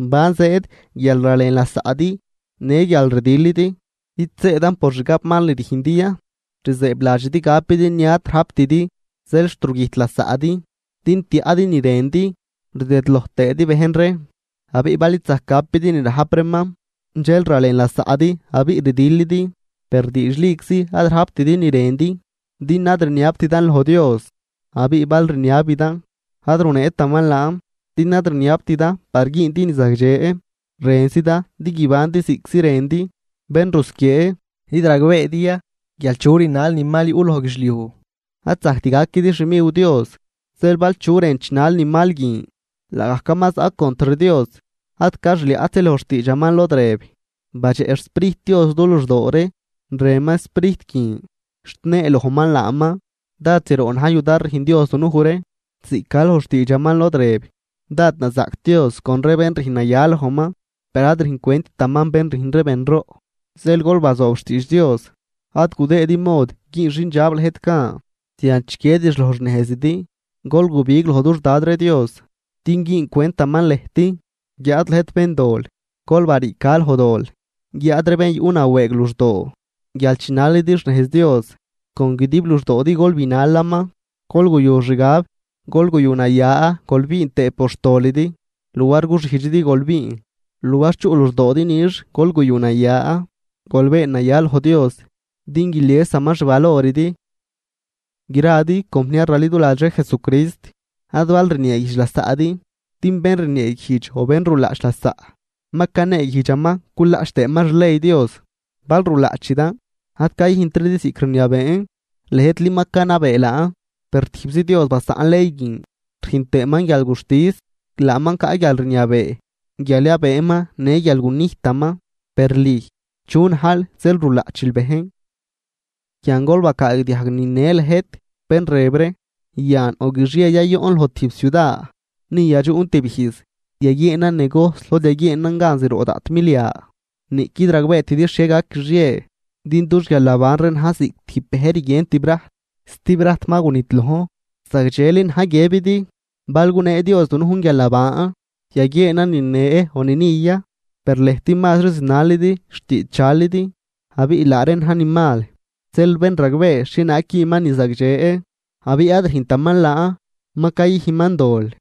¿Ban zëëd guial ralen lasaꞌdi në guial rdilidi? ¿Id zëëdan por xgabmal ni rüjndi ya? Rzëëbladxidi gapidi ni ad rajptidi, zeel xt rugüjt lasaꞌdi din tiaꞌdi ni rëndi, rdëdloj tëëdi bejn ree, abiꞌ bal id zajc gapidi ni rajp reeman, dxel ralen lasaꞌdi abiꞌ rdilidi. Per diidxliczi ad rajptidi ni rëndi, din ad rniabtidan loj Dios. Abiꞌ bal rniabidan, ad runeetaman laan, din ad rniabtidan par güündi ni zagdxe, rënzidan din guibandi ziꞌctzi rëndi. ¡Bén rusquiee! ¿Id ragbeedi ya guial chu rinal ni mal yuꞌ loj guidxliuj ad zajct gaquidi xmiw Dios? Zeel bal chu rën chinal ni mal guin, laagajcaman zaꞌ contr Dios. Ad ca xliaꞌtzi loj xtiidxaman lod rëb: “Badxeꞌ xSprijt Dios du luxdoo ree, rënman Sprijt guin, xt neelojman laaman.” Dád zroꞌ na̱j yudar rüjn Dios dunuj ree, ziꞌc ca loj xtiidxaman lod rëb: “Dád nazaꞌc Dios con ree bén rüjn naya lojman, per ad rüjn cwenttaman bén rüjn ree benroꞌ.” Zeel gol bazoob xtiidx Dios, ad gudëëdi mod güün xindxab lëjt gan, zian chiquiedix loj xnejzidi. Gol gubig loj dux Dad ree Dios din güün cwentaman lëjt, guiáad lëjt béndol, gol bariica loj dol, guiáad ree bén yuꞌ nawëëg luxdoo guial chinalidi xnejz Dios, con guidib luxdoodi gol binalaman. Gol guyu xgab, gol guyu naya gol biin tëë por xtolidi, luar guxijdxidi gol biin, luar chuꞌ luxdoodi nix gol guyu naya, gol been naya loj Dios, din guiliesaman xvaloridi. Gradi compniar raliduladx ree Jesucrist, ad bal rnieeguijdx lasaꞌdi, din bén rnieeguijdx o bén rulaꞌch lasaꞌ, ma caneeguijdxaman culaꞌch tëëman xley Dios. Bal rulaꞌchidan, ad cayüjntridi ziꞌc rniabeen, lëjtli ma canabee laan. Per tijbzi Dios basaꞌn ley guin rüjn tëëman guialguxtis, laaman caꞌ guialrniabee guial yabëëman në guial gunijtaman. Per lüj, ¿chu najl zeel rulaꞌchil bejn? Yan gol bacaagdiajg nine lëjt bén rëb ree: “Yan o guixie ya yoꞌn loj tijb ciuda, ni yadxuꞌn tib ijz, yaguieenan negojs lod yaguieenan gan zroꞌ daꞌt milia.” Niꞌquid ragbeetidi xhie gac guixie, din dux guialnaban ree na̱j ziꞌc tijb bëj rguien tibrajt, stibrajt ma gunidlojn. Zagdxeli na̱j guiëbidi: “Bal gunee Dios dunujn guialnaban, yaguieenan nine o ni ni ya.” Per lëjt mazri zinalidi xtiidx dxalidi, abiꞌ laa reen na̱j ni mal. Zeel bén ragbee xhienaag güünman ni zagdxe abiꞌ ad rüjntaman laan, ma cayüjnman dol.